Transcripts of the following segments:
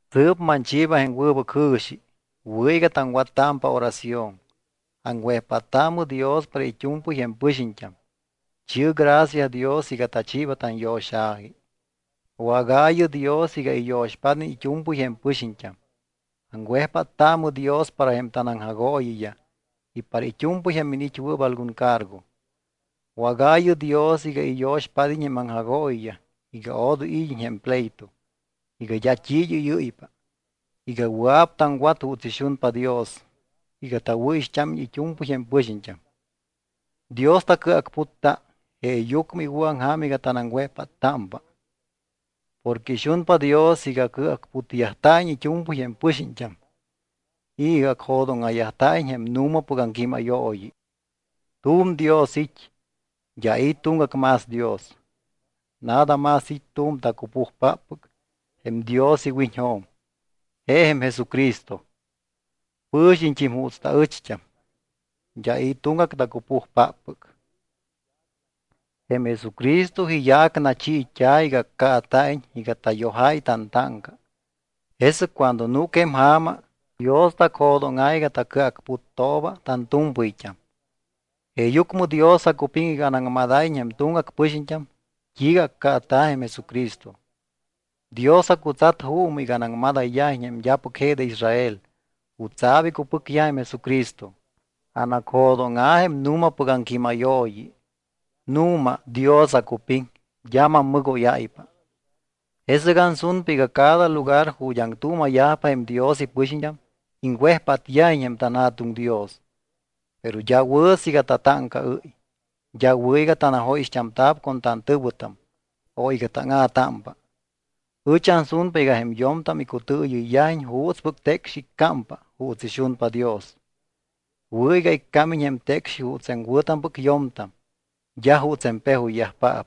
Sɨɨp manchiiba jém wɨbɨc jɨ̱xi. Wɨ̱ iga taŋwattámpa oración. Aŋwejpáttaamɨ Dios para it́u̱mpɨy jém pɨxiñt́am. Chi̱ɨ gracia Dios iga tachiiba tanyo̱xa̱ji. Wágaayɨ Dios iga iyo̱xpád́iñ it́u̱mpɨy jém pɨxiñt́am. Aŋwejpáttaamɨ Dios para jém tanaŋjagooyiyaj y para it́u̱mpɨy jém iniit́wɨɨp algun cargo. Wágaayɨ Dios iga iyo̱xpád́iñ jém aŋjagooyiyaj iga odoy id́iñ jém pleito, iga d́a t́i id́ɨ́yɨ́ypa, iga wɨa̱p taŋwat juuts ixunpa Dios, iga tawɨ̱ixt́ámiñ it́u̱mpɨy jém pɨxiñt́am. Dios tacɨacputta jeeyucmɨ iwɨ̱aŋja̱m iga tanaŋwejpáttámpa. Porque ixunpa Dios iga cɨacputyajta̱iñ it́u̱mpɨy jém pɨxiñt́am y iga acjo̱dóŋa̱yajta̱iñ jém nu̱mapɨc aŋquímayooyi. Tu̱m Dios it́. D́a i̱ tuŋgac más Dios. Nada más it́ tu̱m tacupujpáppɨc jém Dios iwiñjo̱m, je jém Jesucristo, pɨ̱xiñt́im juuts taɨcht́am. D́a i̱ tuŋgac tacupujpáppɨc. Jém Jesucristo iyaac nachiit́a̱ iga accaata̱iñ iga tayojáy tantáŋca. Jesɨc cuando núc jém ja̱ma, Dios tacjo̱dóŋa̱ iga tacɨacputtooba tantu̱mpɨyt́am. Jeeyucmɨ Dios acupiŋ iga anaŋmadáyiñ jém tuŋgac pɨxiñt́am t́iiga accaata̱ jém Jesucristo. Dios acutsat juumɨ iga anaŋmadáyiñ jém d́apɨc je de Israel jutsa̱p icupɨcyaj jém Jesucristo. Anacjo̱dóŋa̱ jém nu̱mapɨc aŋquímayooyi. Nu̱ma Dios acupiŋ. D́a mammɨgóyáypa. Jesɨc ansunpa iga cada lugar ju̱t́ aŋtuuma̱yajpa jém Dios ipɨxiñt́am, iŋwejpátyajiñ jém tanJa̱tuŋ Dios, pero d́a wɨ̱ siiga tatáŋcaɨ́y. D́a wɨ̱ iga tanajóyixt́amta̱p con tantɨ̱wɨtam o iga táŋa̱támpa. Ɨch ansunpa iga jém yo̱mtam icutɨɨyɨyyajiñ juutspɨc tecxi iccámpa juuts ixunpa Dios. Wɨ̱ iga iccámiñ jém tecxi juuts jém wɨ̱tampɨc yo̱mtam, d́a juuts jém pejoyyajpaap.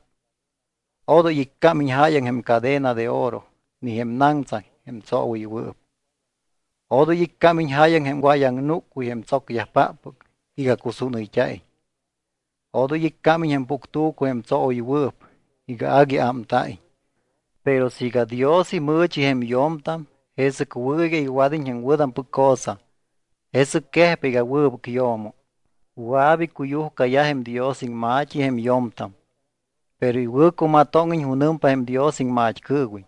Odoy iccámiñ jáyaŋ jém cadena de oro ni jém naŋtsaŋ jém tsoowɨywɨɨp. Odoy iccámiñ jáyaŋ jém wayaŋnúccuy jém tsocyajpáppɨc iga cusúnɨyt́a̱iñ. Odoy iccámiñ jém puctu̱cu jém tsoowɨywɨɨp iga agui ámta̱iñ. Pero siiga Dios imɨɨchi jém yo̱mtam, jesɨc wɨ̱ iga iwad́iñ jém wɨ̱tampɨc cosa. Jesɨc quejpa iga wɨbɨc yo̱mo. Wɨa̱p icuyujcayaj jém Dios iŋma̱t́i jém yo̱mtam. Pero iwɨ̱cumatóŋiñ junɨmpa jém Dios iŋmat́cɨɨwiñ.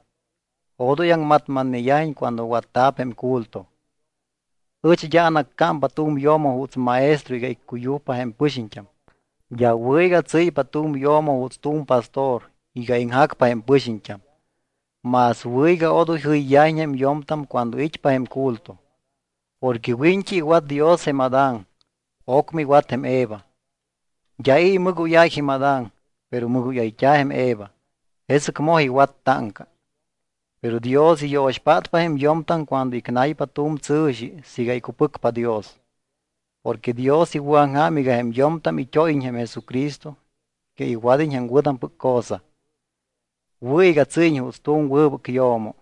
Odoy aŋmatmatneyajiñ cuando watta̱p jém culto. Ɨch d́a anaccámpa tu̱m yo̱mo juuts maestro iga iccuyujpa jém pɨxiñt́am. D́a wɨ̱ iga tsɨ́ypa tu̱m yo̱mo juuts tu̱m pastor iga iŋjacpa jém pɨxiñt́am. Más wɨ̱ iga odoy jɨyyajiñ jém yo̱mtam cuando it́pa jém culto. Porque wiñt́i iwat Dios jém Adán. Ocmɨ iwat jém Eva. D́a i̱ imɨgóyáy jém Adán, pero mɨgóyayt́a̱ jém Eva, jesɨc moj iwat táŋca. Pero Dios iyo̱xpátpa jém yo̱mtam cuando icnaypa tu̱m tsɨ̱xi siiga icupɨcpa Dios. Porque Dios iwɨ̱aŋja̱m iga jém yo̱mtam it́óyiñ jém Jesucristo y iga iwad́iñ jém wɨ̱tampɨc cosa. Wɨ̱ iga tsɨ́yiñ juuts tu̱m wɨbɨc yo̱mo.